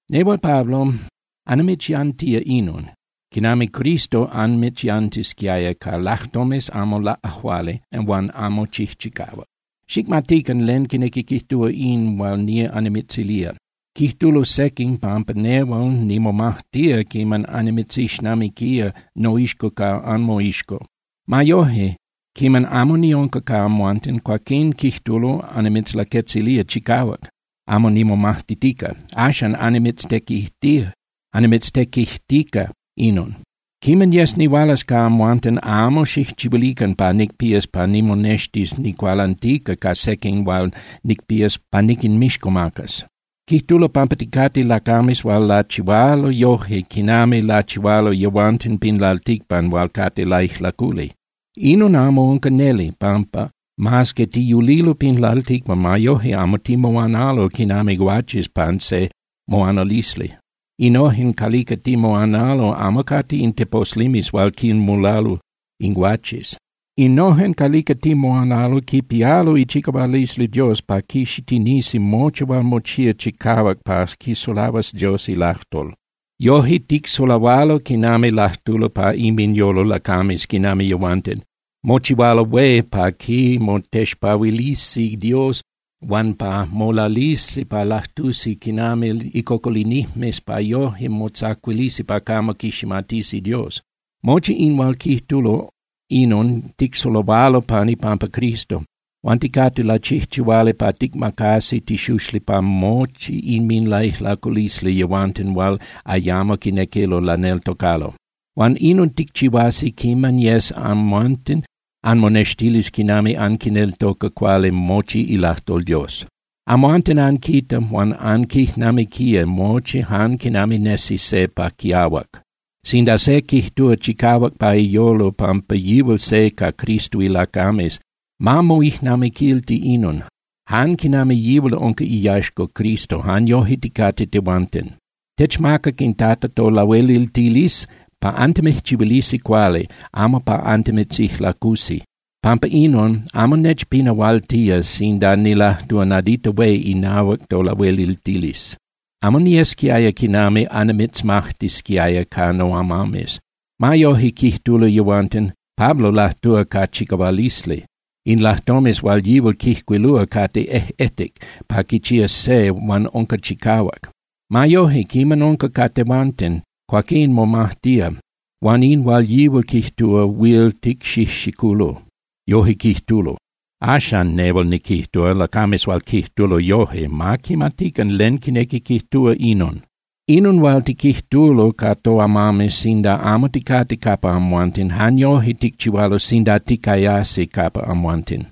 Nehual, Pablo, annimitzyantía inon, quinami Cristo anmitzyantisquiaya, ca lajtomes amo laꞌajuali huan amo chijchicahuac. Xicmatican len quinequi quijtúa in hual nía annimitzilía. Quijtulo sequin pampa nehual nimomajtía quiman annimitzixnamiquía, noixco ca anmoixco. Ma yoje, quiman amo niunca ca amhuanten, cuaquín, quijtulo, annimitzlaquetzilía chicahuac, amo nimomajtitica. Axan annimitztequijtica inon. Quiman yes nihualas ca amhuanten amo xijchihuilican pa nicpías pa nimonextis nicualantica ca sequin hual nicpías pa niquinmixcomacas. Quijtulo pampa ticate lacames hual lachihualo yoje quinami lachihualo yehuanten pin lalticpan hual cate laijlaculi. Inon amo unca neli, pampa mas que tiyulilo pin lalticpan, ma yoje amo timoanalo quinami guaches pan se moanalisli. Innojen calica timoanalo amo cate in teposlimes hual quinmulalo in guaches. Innojen calica timoanalo quipialo ichicahualisli Dios pa quixitinisi mochi hual mochía chicahuac pa quisulahuas Dios ilajtol. Yoje, ticsulahualo quinami lajtulo pa inminyolo lacames quinami yehuanten. Mochihualo hué pa quimotexpahuilisi Dios huan pa molalisi pa lajtusi quinami icocolinijmes pa yoje motzacuilisi pa camo quiximatisi Dios. Mochi in hual quijtulo, inon ticsulahualo pan ipampa Cristo. Huan ticate lachijchihuali pa ticmacasi tixuxli pa mochi inminlaijlaculisli yehuanten hual ayamo quinequilo laneltocalo. Huan inon ticchihuasi quiman yes amhuanten anmonextilis quinami anquineltoca cuali mochi ilajtol Dios. Amhuanten anquita huan anquijnamiquía mochi jan quinami nesi se pa quiahuac. Sinda se quijtúa chicahuac pa iyolo pampa yihual se ca Cristo ilacames, ma moijnamiquilti inon: Jan quinami yihual unca iyaxca Cristo, jan yoje ticate tehuanten. Techmacac in Tata tolahueliltilisli pa antimijchihuilisi cuali, amo pa antimitzijlacusi. Pampa inon, amo nechpinahualtía sinda nilajtúa nadita hué inahuac tolahueliltilisli. Amo niyesquiaya quinami annimitzmajtisquiaya ca noamames. Ma yoje, quijtulo yehuanten: “Pablo lajtúa ca chicahualisli. In lajtomes hual yihual quijcuilúa cate ejꞌetic pa quichías se huan unca chicahuac. Ma yoje, quiman unca ca tehuanten, cuaquín momajtía, huan in hual yihual quijtúa huil ticxijxiculo.” Yoje quijtulo. Axan, nehual niquijtúa, lacames hual quijtulo yoje, ma quimatican len quinequi quijtúa inon. Inon hual tiquijtulo ca toamames sinda amo ticate capa amhuanten, jan yoje ticchihualo sinda ticayasi capa amhuanten.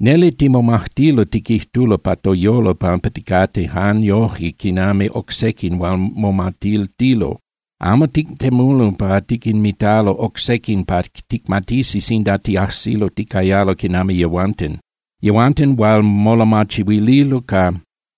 Neli timomajtilo tiquijtulo pa toyolo pampa ticate jan yoje quinami oc sequin hual momatiltilo. Amo tictemulo pa tiquinmitalo oc sequin pa ticmatisi sinda tiajsilo ticayalo quinami yehuanten. Yehuanten hual molamachihuililo ca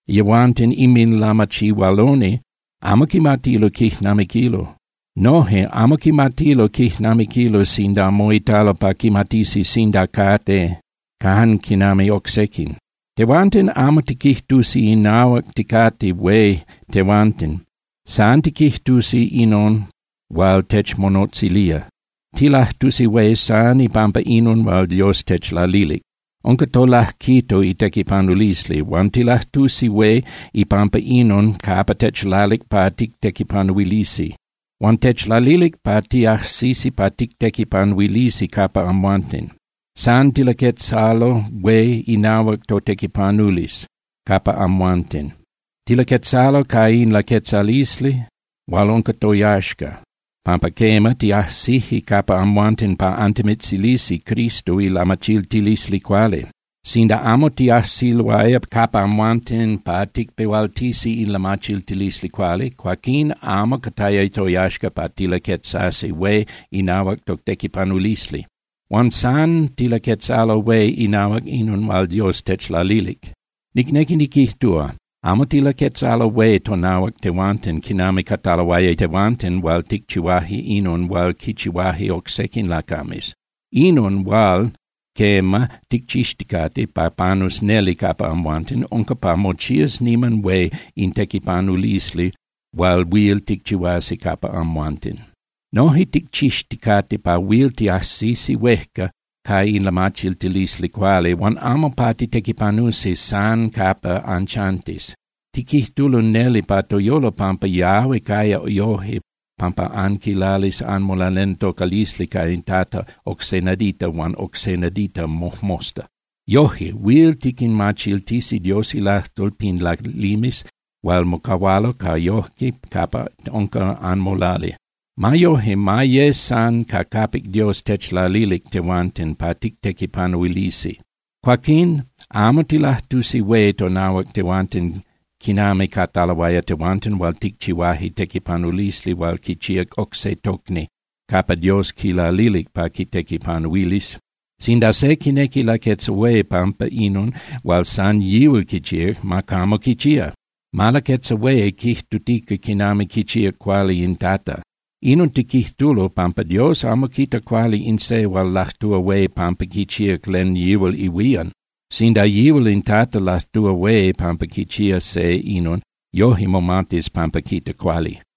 yehuanten inminlamachihualoni amo quimatilo quijnamiquilo. Noje amo quimatilo quijnamiquilo sinda moitalo pa quimatisi sinda cate jan quinami oc sequin. Tehuanten amo tiquijtusi inahuac ticate hué tehuanten. San tiquijtusi inon hual techmonotzilía. Tilajtusi hué san ipampa inon hual Dios techlalilic. Unca tolajquito itequipanulisli. Huan tilajtusi hué ipampa inon capa techlalic pa tictequipanuilisi. Huan techlalilic pa tiajsisi pa tictequipanuilisi capa amhuanten. San tilaquetzalo hué inahuac totequipanulisli capa amhuanten. Tilaquetzalo ca in laquetzalisli hual unca toyaxca, pampa quema, tiajsije capa amhuanten pa antimitzilisi Cristo ilamachiltilisli cuali. Sinda amo tiajsiloaya capa amhuanten pa ticpehualtisi in lamachiltilisli cuali, cuaquín amo cataya toyaxca pa tilaquetzasi hué inahuac totequipanulisli. Huan san tilaquetzalo hué inahuac inon hual Dios techlalilic. Nicnequi niquijtúa, amo tilaquetzalo hué tonahuac tehuanten quinami cataloaya tehuanten hual ticchihuaje inon hual quichihuaje oc sequin lacames. Inon hual, quema, ticchixticate pa panus neli capa amhuanten unca pa mochías niman hué in tequipanulisli hual huil ticchihuasi capa amhuanten. Noje ticchixticate pa huil tiajsisi huejca ca in lamachiltilisli cuali huan amo pa titequipanusi san capa anchantis. Tiquijtulo neli pa toyolo pampa yahui caya yoje pampa anquilalis anmolaneltocalisli ca in Tata oc se nadita huan oc se nadita mojmosta. Yoje, huil tiquinmachiltisi Dios ilajtol pin lalimes hual mocahualo ca yoje capa unca anmolali. Ma yoje, ma ye san ca capic Dios techlalilic tehuanten pa tictequipanuilisi. Cuaquín amo tilajtusi hué tonahuac tehuanten quinami cataloaya tehuanten hual ticchihuaje tequipanulisli hual quichíac oc se tocni capa Dios quilalilic pa quitequipanuilis. Sinda se quinequi laquetza hué pampa inon hual san yihual quichíac, ma camo quichía. ¡Ma laquetza hué quijtutica quinami quichíac cuali in Tata! Inon tiquijtulo, pampa Dios amo quita cuali in se hual lajtúa hué pampa quichíac len yihual ihuían. Sinda yihual in Tata lajtúa hué pampa quichía se inon, yoje momatis pampa quita cuali.